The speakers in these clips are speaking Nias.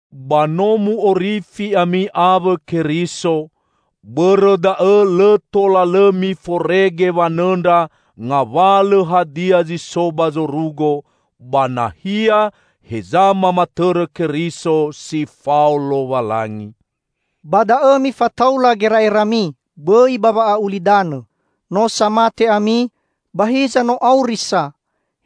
Ba no mu'orifi ami awõ Keriso, bõrõ da'õ lõ tola lõ miforege wanõndra ngawalõ hadia zi so ba zorugo, ba nahia heza mamatõrõ Keriso si fao Lowalangi. Ba da'õ mifataula gera'erami, bõi ba wa'a'ulidanõ. No sa mate ami, ba hiza no auri sa,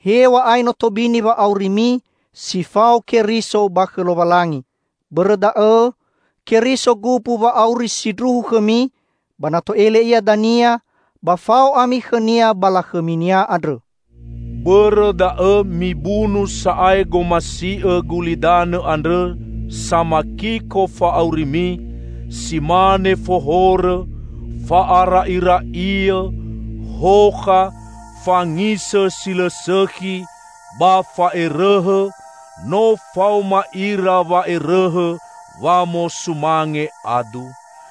hew̃a'ae no tobini wa'aurimi si fao Keriso ba khõ Lowalangi. Bõrõ da'õ, Keriso gumbu wa'auri sindruhu khõmi, ba na to'ele Ia dania, ba fao ami khõ-Nia ba lakhõmi-Nia andrõ. Bõrõ da'õ mibunu sa'ae gomasiõ gulidanõ andrõ samakiko fa'aurimi, si mane fohorõ, fa'ara'ira'iõ, hokha, fangisõ si lõ sõkhi, ba fa'erõhõ (no faoma ira wa'erõhõ wamosumange adu).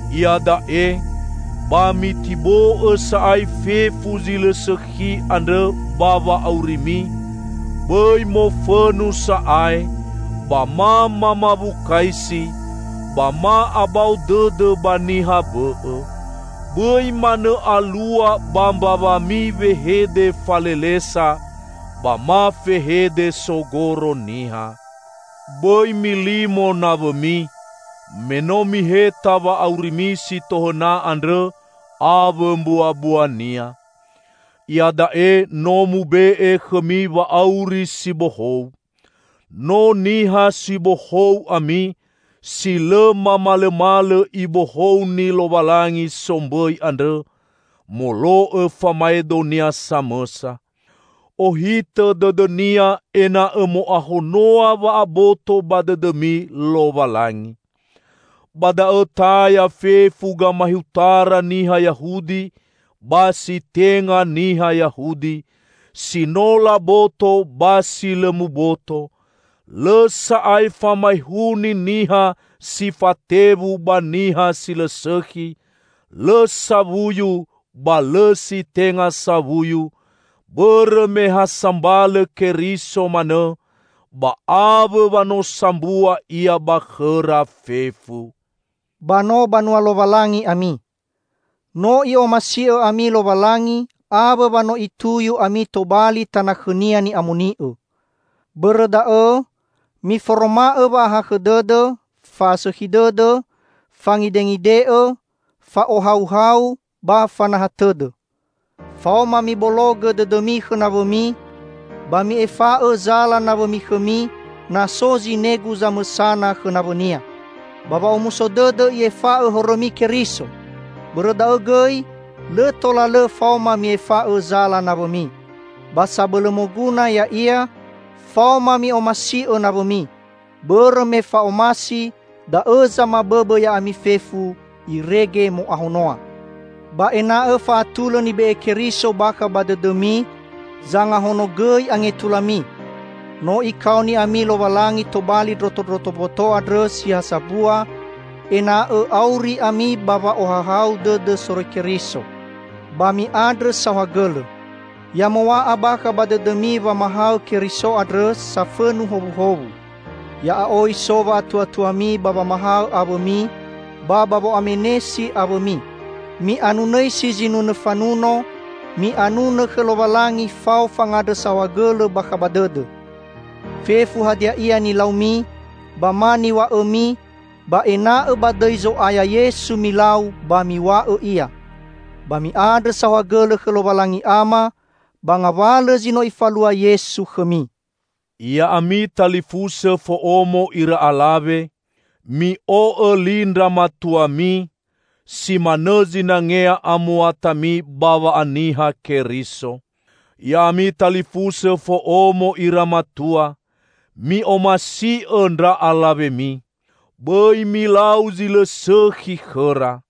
Iada'e, ba mitibo'õ sa'ae fefu zi lõ sõkhi andrõ ba wa'aurimi: bõi mofõnu sa'ae, ba ma mamawukaisi, ba ma abao dõdõ ba niha bõ'õ. Bõi manõ alua ba mbawami wehede falelesa, ba ma fehede sogoro niha. Bõi milimo nawõmi, me no miheta wa'aurimi si tohõna andrõ awõ mbuabuania. Ia da'e no mube'e khõmi wa'auri si bohou. No niha si bohou ami, si lõ mamalõmalõ Ibohouni Lowalangi sombõi andrõ, molo'õ famaedo-Nia samõsa. Ohitõ dõdõ-Nia ena'õ mo'ahonoa wa'aboto ba dõdõmi Lowalangi. Ba da'õ taya fefu gamaehutara niha Yahudi ba si tenga niha Yahudi, si no laboto ba si lõ muboto, lõ sa'ae famaehuni niha si fatewu ba niha si lõ sõkhi, lõ sawuyu ba lõ si tenga sawuyu, bõrõ me ha sambalõ Keriso manõ, ba awõ wa no sambua Ia ba khõra fefu! Ba no banua Lowalangi ami. No I'omasi'õ ami Lowalangi awõ wa no Ituyu ami tobali tana khõ-Nia ni'amoni'õ. Bõrõ da'õ miforoma'õ wa'ahakhõ dõdõ, fa'asõkhi dõdõ, fangidengide'õ fa'ohauhau ba fanaha tõdõ. Faoma mibologõ dõdõmi khõ nawõmi, ba mi'efa'õ zala nawõmi khõmi, na so zinegu zamõsana khõ nawõnia. Ba wa'omuso dõdõ I'efa'õ horõmi Keriso, bõrõ da'õ gõi lõ tola lõ faoma mi'efa'õ zala nawõmi. Ba sabõlõ moguna, ya'ia: Faoma mi'omasi'õ nawõmi, bõrõ me fa'omasi da'õ zamabõbõ ya'ami fefu, irege mo'ahonoa. Ba ena'õ fa'atulõ nibe'e Keriso bakha ba dõdõmi zangahonogõi angetulami. No Ikaoni ami Lowalangi tobali ndrotondroto mboto andrõ si ha sambua, ena'õ auri ami ba wa'ohahau dõdõ soroi Keriso. Ba mi'andrõ saohagõlõ. Ya mow̃a'a bakha ba dõdõmi wamahaõ Keriso andrõ, safõnu howuhowu. Ya'a'oi so wa'atuatuami ba wamahaõ awõmi ba ba wo'amenesi awõmi. Mi'anunõisi zinunõ fanuno; mi'anunõ khõ Lowalangi fao fangandrõ saohagõlõ bakha ba dõdõ. Fefu hadia ia nilaumi ba ma niw̃a'õmi, ba ena'õ ba dõi Zo'aya Yesu milau ba miw̃a'õ ia. Ba mi'andrõ saohagõlõ khõ Lowalangi Ama, ba ngawalõ zi no Ifalua Yesu khõmi. Ya'ami talifusõ fo'omo ira alawe! Mi'o'õ li ndra matuami, si manõ zinangea amuatami ba wa'aniha Keriso. Ya'ami talifusõ fo'omo ira matua! Mi'omasi'õ ndra alawemi. Bõi milau zi lõ sõkhi khõra.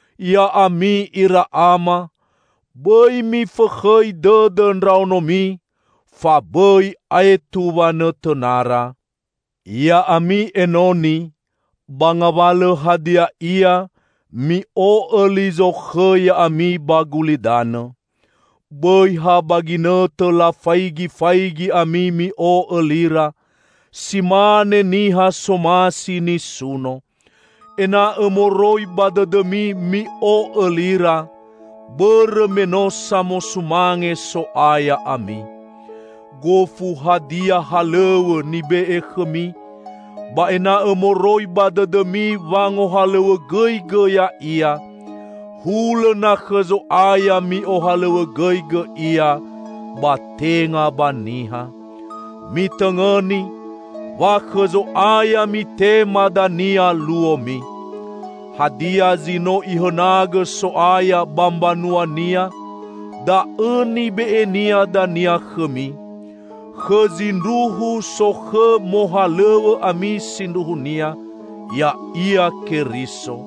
Ya'ami ira ama! Bõi mifõkhõi dõdõ ndraonomi, fa bõi aetu wanõtõnara. Ya'ami enoni! Ba ngawalõ hadia ia, mi'o'õ li zokhõ ya'ami ba gulidanõ. Bõi ha ba ginõtõ lafaigifaigi ami mi'o'õ lira, si mane niha somasi nisuno. Ena'õ moroi ba dõdõmi mi'o'õ lira, bõrõ me no samosumange So'aya ami. Gofu hadia halõw̃õ nibe'e khõmi, ba ena'õ moroi ba dõdõmi wangohalõw̃õgõigõ ya'ia, hulõ na khõ Zo'aya mi'ohalõw̃õgõigõ ia, ba tenga ba niha. Mitõngõni, wa khõ Zo'aya mitema dania luomi. Hadia zi no Ihõnagõ So'aya ba mbanua-Nia, da'õ nibe'e-Nia dania khõmi. Khõ zindruhu sokhõ mohalõw̃õ ami sindruhunia, ya'ia Keriso.